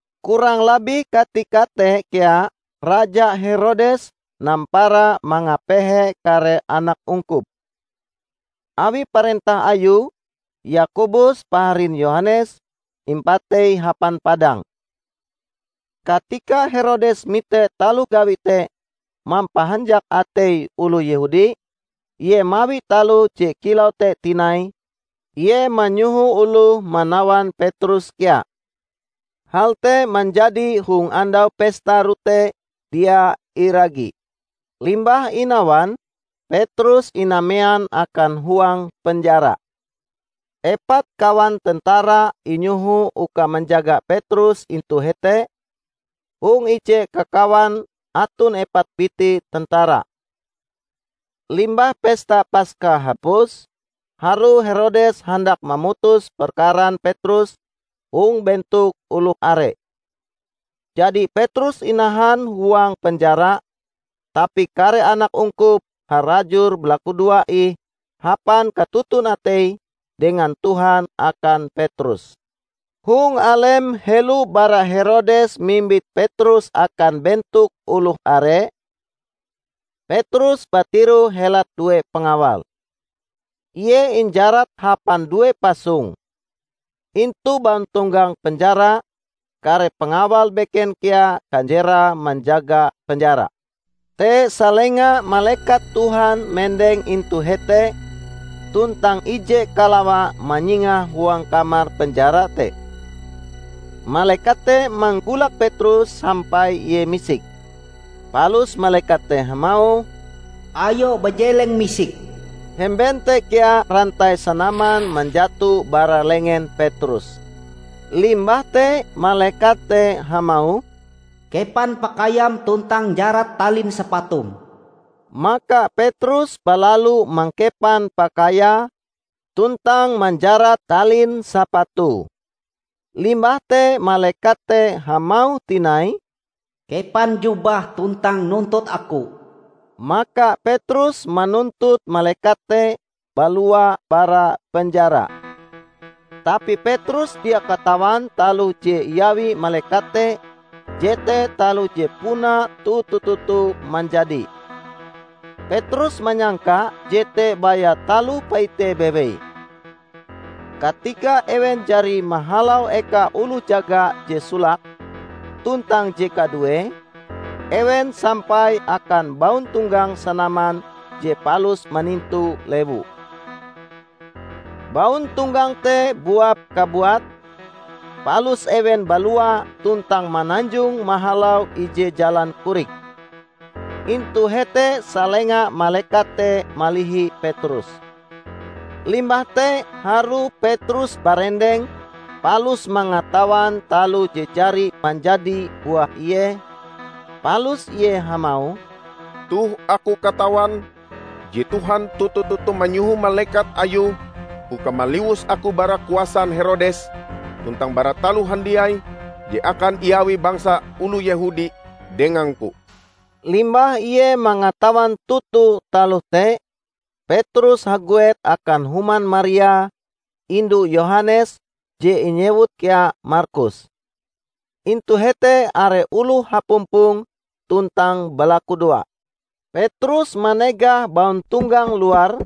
Kurang labih katika te kea Raja Herodes nampara mangapehe kare anak ungkup. Awi parentah ayue, Yakobus paharin Yohanes, impatei hapan padang. Katika Herodes mite taloh gawie te mampahanjak atei oloh Yehudi, ie mawi taloh je kilau te tinai; ie manyoho oloh manawan Petrus kea. Hal te manjadi hong Andau Pesta Rote Dia Iragi. Limbah inawan, Petrus inamean akan huang penjara. Epat kawan tentara inyoho uka manjaga Petrus intu hete -- hong ije kakawan aton epat biti tentara. Limbah pesta Paska hapus, harue Herodes handak mamutus perkaran Petrus hong bentok oloh are. Jadi Petrus inahan huang penjara; tapi kare anak ungkup harajur balakudoa ih hapan katoton ateie dengan Tuhan akan Petrus. Hong alem helo bara Herodes mimbit Petrus akan bentok oloh are, Petrus batiroh helat due pangawal. Ie injarat hapan due pasong. Intu bauntonggang penjara, kare pangawal beken kea kanjerae manjaga penjara. Te salenga malekat Tuhan mendeng intu hete tuntang ije kalawa manyingah huang kamar penjara te. Malekat te manggolak Petrus sampai ie misik. Palus malekat te hamauh, "Ayo bajeleng misik!" Hemben te kea rantai sanaman manjato bara lengen Petrus. Limbah te malekat te hamauh, "Kepan pakaiam tuntang njarat talin sapatum." Maka Petrus balalu mangkepan pakaiae tuntang manjarat talin sapatue. Limbah te malekat te hamauh tinai, "Kepan jubahm tuntang nuntut aku." Maka Petrus manuntut malekat te balua bara penjara. Tapi Petrus dia katawan taloh je iawi malekat te jete taloh je puna toto-toto manjadi. Petrus manyangka jete baya taloh paite bewei. Katika ewen jari mahalau eka oloh jaga je solake tuntang je kaduee, ewen sampai akan bauntonggang sanaman je palus manintu lewu. Bauntonggang te buap kabuate, palus ewen balua tuntang mananjong mahalau ije jalan korik. Intu hete salenga malekat te malihi Petrus. Limbah te harue Petrus barendeng palus mangatawan taloh je jari manjadi buah ie, palus ie hamauh, "Toh aku katawan je Tuhan toto-toto manyoho malekat ayue uka maliwus aku bara kuasan Herodes tuntang bara taloh handiai je akan iawi bangsa oloh Yehudi dengangku." Limbah ie mangatawan toto taloh te, Petrus haguet akan human Maria, indu Yohanes je inyewut kea Markus. Intu hete are oloh hapumpong tuntang balakudoa. Petrus manegah bauntonggang luar,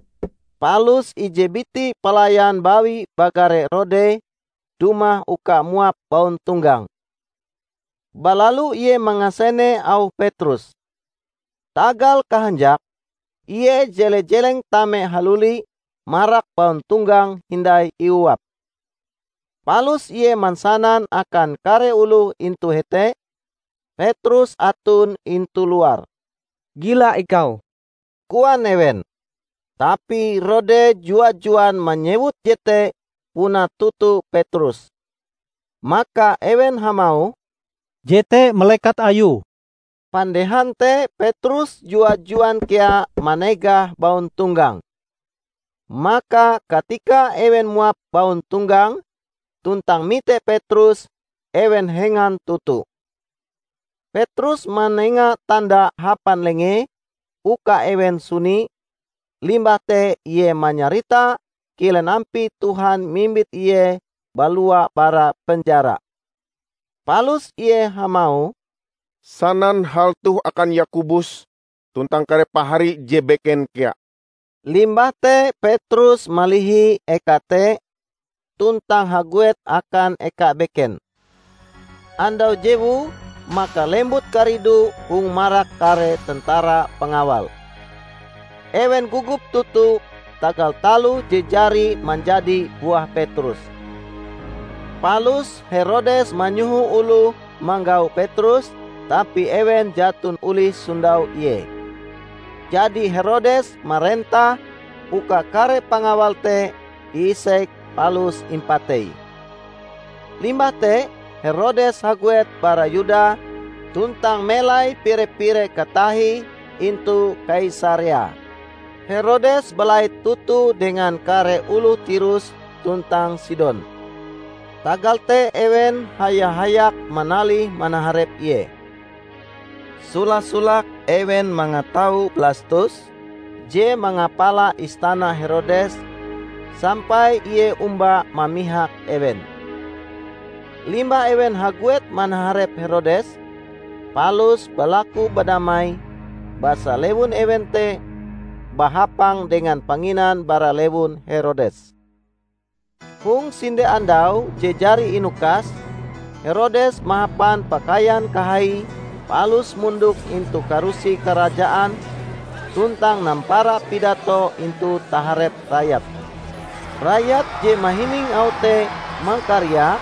palus ije biti pelayan bawi bagare Rode, dumah uka muap bauntonggang. Balalu ie mangasene auh Petrus. Tagal kahanjake, ie jele-jeleng tame haluli marak bauntonggang hindai iuap. Palus ie mansanan akan kare oloh intu hete, Petrus aton intu luar. "Gila ikau!" koan ewen. Tapi Rode jua-juan manyewut jete puna toto Petrus. Maka ewen hamauh, "Jete malekat ayue!" Pandehan te Petrus jua-juan kea manegah bauntonggang. Maka katika ewen muap bauntonggang, tuntang mite Petrus, ewen hengan toto. Petrus manenga tanda hapan lengee uka ewen suni, limbah te ie manyarita kilen ampie Tuhan mimbit ie balua bara penjara. Palus ie hamauh, "Sanan hal toh akan Yakobus tuntang kare pahari je beken kea." Limbah te Petrus malihi eka te tuntang haguet akan eka beken. Andau jewue maka lembut karidu hong marak kare tentara pangawal. Ewen gogop toto tagal taloh je jari manjadi buah Petrus. Palus Herodes manyoho oloh manggau Petrus, tapi ewen jaton olih sondau ie. Jadi Herodes marentah uka kare pangawal te iisek palus impatei. Limbah te Herodes haguet bara Yuda tuntang melai pire-pire katahie intu Kaisarea. Herodes balait toto dengan kare oloh Tirus tuntang Sidon. Tagal te ewen haya-hayak manalih manaharep ie. Sola-solake ewen mangatau Blastus, je mangapala istana Herodes, sampai ie omba mamihak ewen. Limbah ewen haguet manaharep Herodes, palus balaku badamai, basa lewun ewen te bahapang dengan panginan bara lewun Herodes. Hong sinde andau je jari inukas, Herodes mahapan pakaian kahaie palus mondok intu karusi karajaan tuntang nampara pidato intu taharep rayat. Rayat je mahining auh te mangkariak,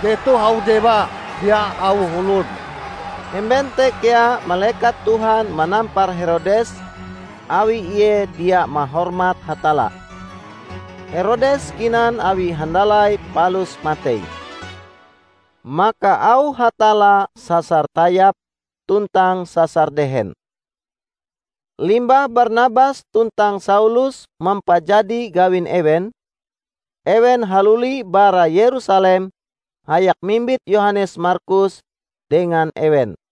"Jetoh auh dewa, dia auh olon!" Hemben te kea malekat Tuhan manampar Herodes, awi ie dia mahormat Hatalla. Herodes kinan awi handalai palus matei. Maka auh Hatalla sasar tayap tuntang sasar dehen. Limbah Barnabas tuntang Saulus mampajadi gawin ewen, ewen haluli bara Yerusalem hayak mimbit Yohanes Markus dengan ewen.